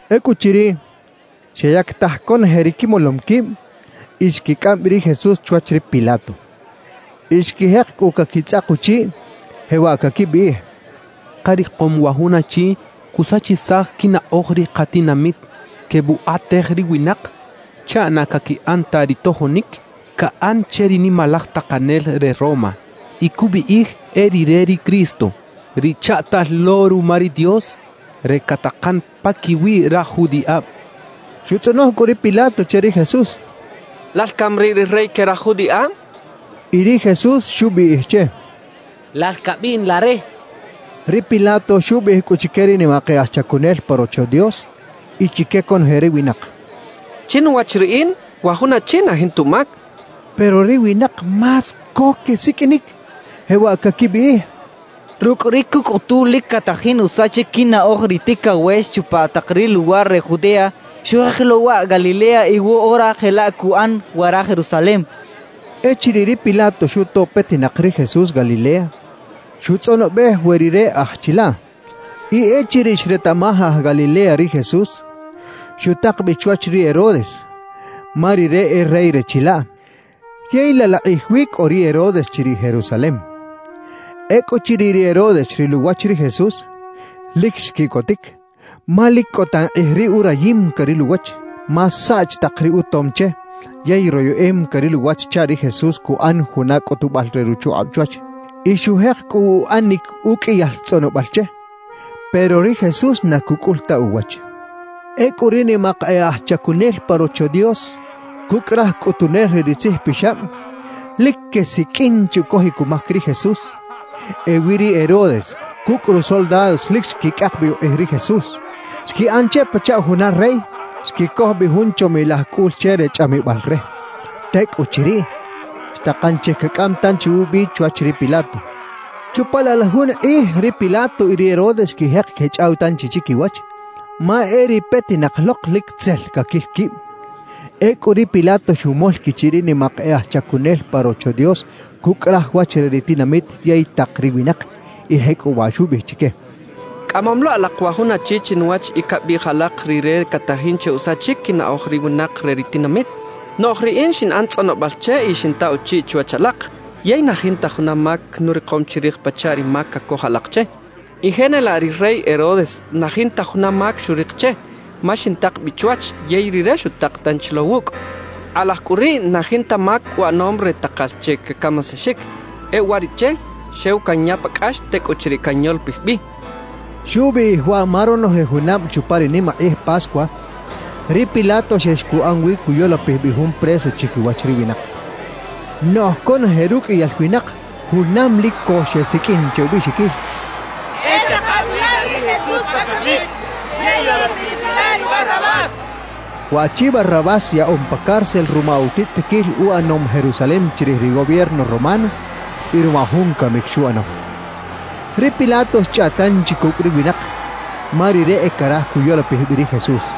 Ecꞌuchiriꞌ, xeyactaj conoje ri quimolom quib y xquicꞌam bi ri Jesús chwach ri Pilato. Y xquijek cꞌu caquitzꞌak uchiꞌ, jewaꞌ caquibiꞌij: —Karikom wa jun achi cusachisaj quinaꞌoj ri katinamit, quebukꞌatej ri winak chaꞌ na caquiꞌan ta ri tojonic caꞌan che ri nimalaj takanel re Roma y cubiꞌij e rire ri Cristo, ri chaꞌtal lo ruma ri Dios re catakan paquiwi raj judiꞌab —quechaꞌ. Xutzꞌonoj cꞌu ri Pilato che ri Jesús: —¿Lal cami riꞌ ri rey que raj judiꞌab? —xchaꞌ. Y ri Jesús xubiꞌij che: —Lal cabiꞌn la re —xchaꞌ. Ri Pilato xubiꞌij cꞌu chique ri nimak e aj chacunel pa Rocho Dios y chique conoje ri winak: —Chinuwach riꞌin, wa jun achi na jinta umac —xchaꞌ. Pero ri winak más co quesiqꞌuinic, jewaꞌ caquibiꞌij: —Rucꞌ ri cucꞌutu lic catajin usachic quinaꞌoj ri ticawex chupa tak ri luwar re Judea; xujek lo waꞌ Galilea y woꞌora jelaꞌ cuꞌan wara Jerusalem —quechaꞌ. Echiriꞌ ri Pilato xuto petinak ri Jesús Galilea, xutzꞌonobej we rire aj chilaꞌ. Y echiriꞌ xretaꞌmaj aj Galilea ri Jesús, xutak bi chwach ri Herodes, ma rire e rey re chilaꞌ, yey laꞌ laꞌ kꞌij wi cꞌo ri Herodes chiriꞌ Jerusalem. Ecꞌuchiriꞌ ri Herodes xril uwach ri Jesús, lic xquiꞌcotic, ma lic cꞌo tan kꞌij riꞌ urayim caril uwach. Ma saꞌch tak ri utom che yey royeꞌem caril uwach chaꞌ ri Jesús cuꞌan juna cꞌutubal re ruchukꞌab chwach. Y xujek cꞌu uꞌanic uqꞌuiyal tzꞌonobal che, pero ri Jesús na cucꞌul ta uwach. Ecꞌu ri nimak e aj chacunel pa Rocho Dios cucꞌ raj cꞌutunel re ri tzijpixab, lic quesiqꞌuin che ucojic umac ri Jesús. Ewi ri Herodes cucꞌ rusoldados lic xquicꞌak bi ukꞌij ri Jesús; xquiꞌan che pachaꞌ juna rey, xquicoj bi jun chomilaj cꞌul che re chꞌamibal re. Tecꞌuchiriꞌ, xtakan che cacꞌam tanchi ubi chwach ri Pilato. Chupa laꞌ la jun kꞌij ri Pilato y ri Herodes xquijek quechꞌaw tanchi chiquiwach, ma e ri petinak lok lic tzel caquil quib. Ecꞌu ri Pilato xumol quichiꞌ ri nimak e aj chacunel pa Rocho Dios cucꞌ raj wach re ri tinamit yey tak ri winak, y jecꞌuwaꞌ xubiꞌij chique: —Cꞌamom lo alak wa jun achi chinuwach y cabiꞌij alak rire catajin che usachic quinaꞌoj ri winak re ri tinamit. Noꞌj riꞌin xinꞌan tzꞌonobal che y xinta uchiꞌ chiwach alak, yey na jinta juna mac nurikom chirij pachaꞌ ri mac cacoj alak che. Y jenelaꞌ ri rey Herodes, na jinta juna mac xurik che; ma xintak bi chwach, yey rire xutak tanchi lo wucꞌ. Kꞌalaj cꞌu riꞌ na jinta mac uꞌanom re takal che cacamisaxic. E uwariꞌche xew canya pa cꞌax; tecꞌuchiriꞌ canyolopij bi —xchaꞌ. (Xubiꞌij waꞌ ma ronoje junab chupa ri nimakꞌij Pascua, ri Pilato xex cuꞌan wi cuyolopij bi jun preso chiquiwach ri winak.) Noꞌj conoje ruqꞌuiyal winak junam lic co xesiqꞌuin che ubiꞌxiquil: —¡E taka bi la ri Jesús pa camic yey yolopij bi la ri Barrabás! —xechaꞌ. (Waꞌchi Barrabás yaꞌom pa cárcel ruma utitzꞌitiquil uꞌanom Jerusalem chirij ri gobierno romano y ruma jun camic xuꞌano.) Ri Pilato xchꞌaꞌt tanchi cucꞌ ri winak, ma rire e caraj cuyolopij bi ri Jesús.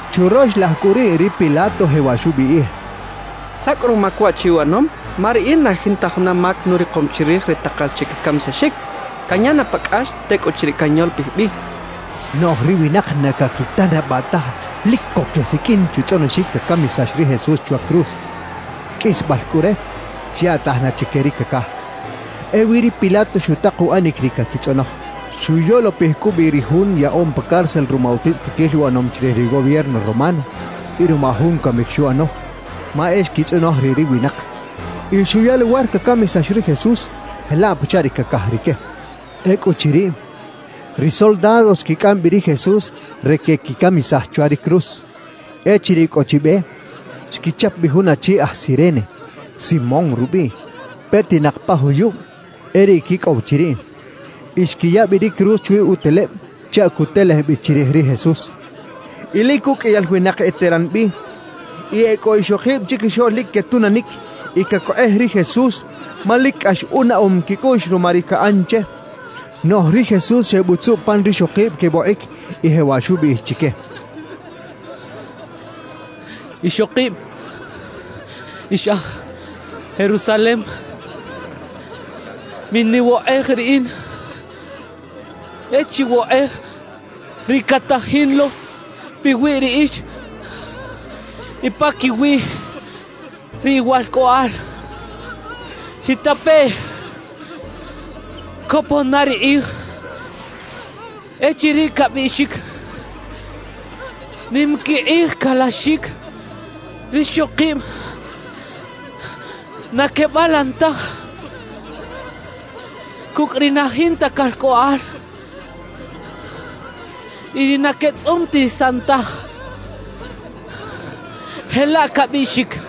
Churox laj cꞌu riꞌ ri Pilato jewaꞌ xubiꞌij: —¿Saꞌ cꞌu rumac waꞌchi uꞌanom? Ma riꞌin na jinta juna mac nurikom chirij re takal che cacamisaxic. Canya na pa cꞌax, tecꞌuchiriꞌ canyolopij bi —xchaꞌ. Noꞌj ri winak na caquitanabaꞌ taj lic co quesiqꞌuin che utzꞌonoxic cacamisax ri Jesús chwa cruz. Qꞌuisbal cꞌu re, xyaꞌtaj na chique ri cacaj. Ewi ri Pilato xutak uꞌanic ri caquitzꞌonoj: xuyolopij cꞌu bi ri jun yaꞌom pa cárcel ruma utitzꞌitiquil uꞌanom chirij ri gobierno romano y ruma jun camic xuꞌano, ma e xquitzꞌonoj riꞌ ri winak. Y xuya luwar cacamisax ri Jesús, jelaꞌ pachaꞌ ri cacaj rique. Ecꞌuchiriꞌ, ri soldados xquicꞌam bi ri Jesús re queꞌquicamisaj chwa ri cruz. Echiriꞌ cꞌo chi be, xquichap bi jun achi aj Cirene, Simón rubiꞌ, petinak pa juyub e riꞌ quicꞌow chiriꞌ. Y xquiya bi ri cruz chwi uteleb chaꞌ cutelej bi chirij ri Jesús. Y lic uqꞌuiyal winak eteran bi. Y e cꞌo ixokib chiquixoꞌl lic quetunanic y cacokꞌej ri Jesús, ma lic cꞌax unaꞌom quicꞌuꞌx ruma ri caꞌan che. Noꞌj ri Jesús xebutzuꞌ pan rixokib quebokꞌic y jewaꞌ xubiꞌij chique: —Ixokib ix aj Jerusalem, miniwokꞌej riꞌin; e chiwokꞌej ri catajin lo piwi riꞌix y paquiwiꞌ ri iwalcꞌoꞌal. ¡Chitapeꞌ! Copon na ri kꞌij echiriꞌ cabiꞌxic: “Nim quikꞌij calaxic rixokib na quebalan taj cucꞌ ri na jinta calcꞌoꞌal y ri na quetzꞌumtisan taj” jelaꞌ cabiꞌxic.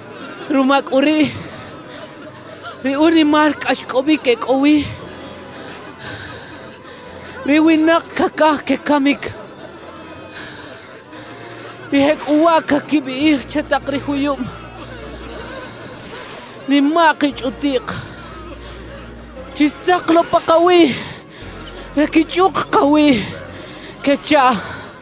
Ruma cꞌu riꞌ ri unimal cꞌaxcꞌobic e cꞌo wi, ri winak cacaj quecamic y jecꞌuwaꞌ caquibiꞌij che tak ri juyub nimaꞌk y chꞌutiꞌk: Chix-tzaka lo pakawiꞌ re quichꞌuk kawiꞌ quechaꞌ.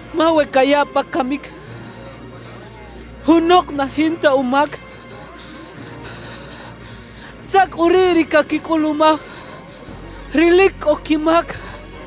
Ma we cayaꞌ pa camic junok na jinta umac, ¿saꞌ cꞌu riꞌ ri caquicꞌulumaj ri lic cꞌo quimac? —xchaꞌ.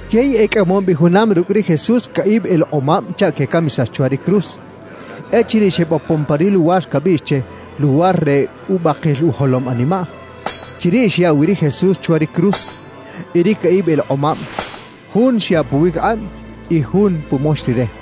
Yey ecꞌamom bi junam rucꞌ ri Jesús caꞌib elekꞌomab chaꞌ quecamisax chwa cruz. Echiriꞌ xebopon pa ri luwar cabiꞌx che “Luwar re Ubakil Ujolom Animaꞌ”, chiriꞌ xyaꞌ wi ri Jesús chwa ri cruz; y ri caꞌib elekꞌomab, jun xyaꞌ puwiquikꞌab y jun pumox Rire.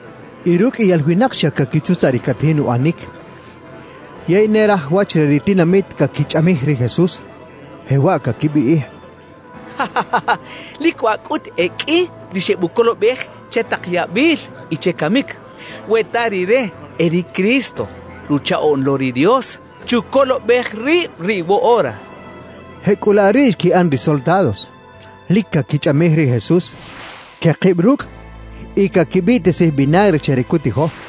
Y ruqꞌuiyal winak xa caquitzutzaꞌ ri catajin uꞌanic. Yey ne raj wach re ri tinamit caquichꞌamij ri Jesús, jewaꞌ caquibiꞌij: —Lic waꞌ cꞌut e qꞌui ri xebucolobej che tak yabil y che camic. We ta rire e ri Cristo, Ruchaꞌoꞌn lo ri Dios, chucolobej rib riꞌ woꞌora, —quechaꞌ. Jecꞌulaꞌ riꞌ xquiꞌan ri soldados, lic caquichꞌamij ri Jesús. Quekib rucꞌ y caquibiꞌtisij vinagre che re cutijo,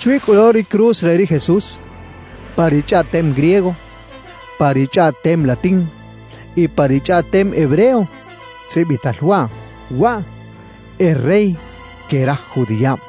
Chwi cꞌu lo ri cruz re ri Jesús, pa ri chꞌaꞌtem griego, pa ri chꞌaꞌtem latín y pa ri chꞌaꞌtem hebreo tzꞌibital waꞌ: «WAꞌ E REY QUE RAJ JUDIꞌAB.»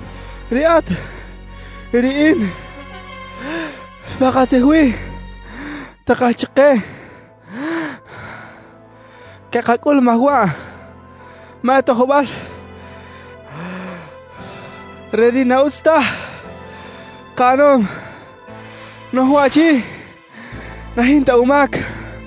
Riꞌat y riꞌin pakatzij wi, takal chike cakacꞌulumaj waꞌ, ma e tojbal re ri na utz taj kaꞌanom. Noꞌj waꞌchi na jinta umac —xchaꞌ.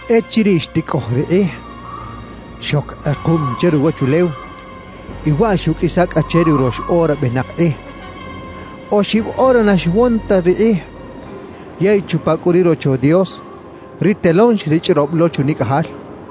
Echiriꞌ xticꞌoj ri kꞌij, xoc kꞌekuꞌm che ruwachulew y waꞌ xuꞌqꞌuisa cꞌa che ri urox ora benak kꞌij; oxib ora na xwon ta ri kꞌij. Yey chupa cꞌu ri Rocho Dios, ri telón xrichꞌrob lo chunicꞌajal.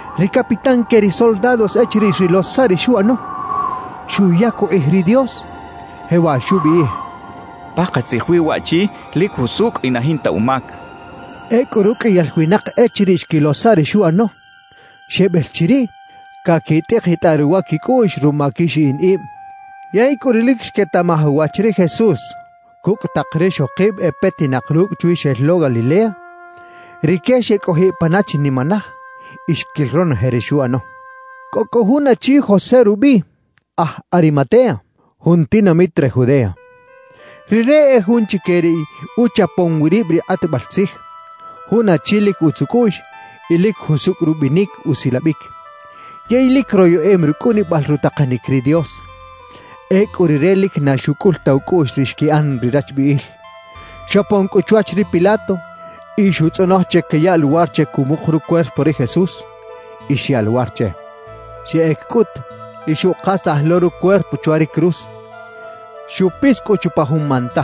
Ri capitán que ri soldados echiriꞌ xrilo saꞌ ri xuꞌano, xuyac ukꞌij ri Dios, jewaꞌ xubiꞌij: —Pakatzij wi waꞌchi lic jusucꞌ y na jinta umac —xchaꞌ. Ecꞌu ruqꞌuiyal winak echiriꞌ xquilo saꞌ ri xuꞌano, xebel chiriꞌ, caquitꞌikitꞌaꞌ ruwa quicꞌuꞌx ruma quixiꞌin ib. Yey cꞌu ri lic xquetaꞌmaj uwach ri Jesús cucꞌ tak rixokib e petinak rucꞌ chwi xel lo Galilea, rique xecꞌojiꞌ pana chinimanaj y xquil ronoje ri xuꞌano. Cꞌo cꞌu jun achi José rubiꞌ, aj Arimatea, jun tinamit re Judea. Rire e jun chique ri uchapom wi rib ri kꞌatbal tzij, jun achi lic utz ucꞌuꞌx y lic jusucꞌ rubinic usilabic. Yey lic royeꞌem rucꞌunibal rutakanic ri Dios. Ecꞌu rire lic na xucꞌul ta ucꞌuꞌx ri xquiꞌan ri rachbiꞌil. Xopon cꞌu chwach ri Pilato y xuꞌtzꞌonoj che cayaꞌ luwar che cumuk rucuerpo ri Jesús. Y xyaꞌ luwar che. Xeꞌec cꞌut y xuꞌkasaj lo rucuerpo chwa ri cruz. Xupis cꞌu chupa jun manta.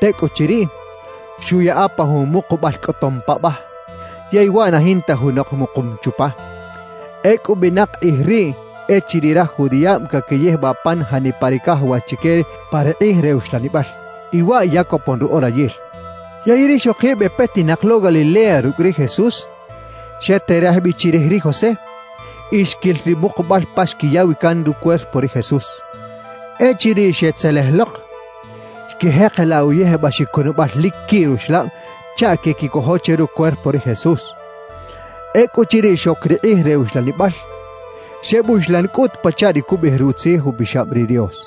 Tecꞌuchiriꞌ, xuꞌyaꞌa pa jun mukubal cꞌotom paꞌbaj, yey waꞌ na jinta junok mukum chupa. Ecꞌu benak kꞌij riꞌ echiriꞌ raj judiꞌab caquiyijbaꞌ pan janipa ri cajawax chique pa ri kꞌij re uxlanibal, y waꞌ ya copon ru orayil. Yey rixokib e petinak lo Galilea rucꞌ ri Jesús, xeterej bi chirij ri José y xquil ri mukubal pa xquiya wi can rucuerpo ri Jesús. Echiriꞌ xetzelej lok, xquijekelaꞌ uyijbaxic cunabal lic quiꞌ ruxlab chaꞌ queꞌquicojo che rucuerpo ri Jesús. Ecꞌuchiriꞌ xoc ri kꞌij re uxlanibal, xebuxlan cꞌut pachaꞌ ri cubiꞌij Rutzij Upixab ri Dios.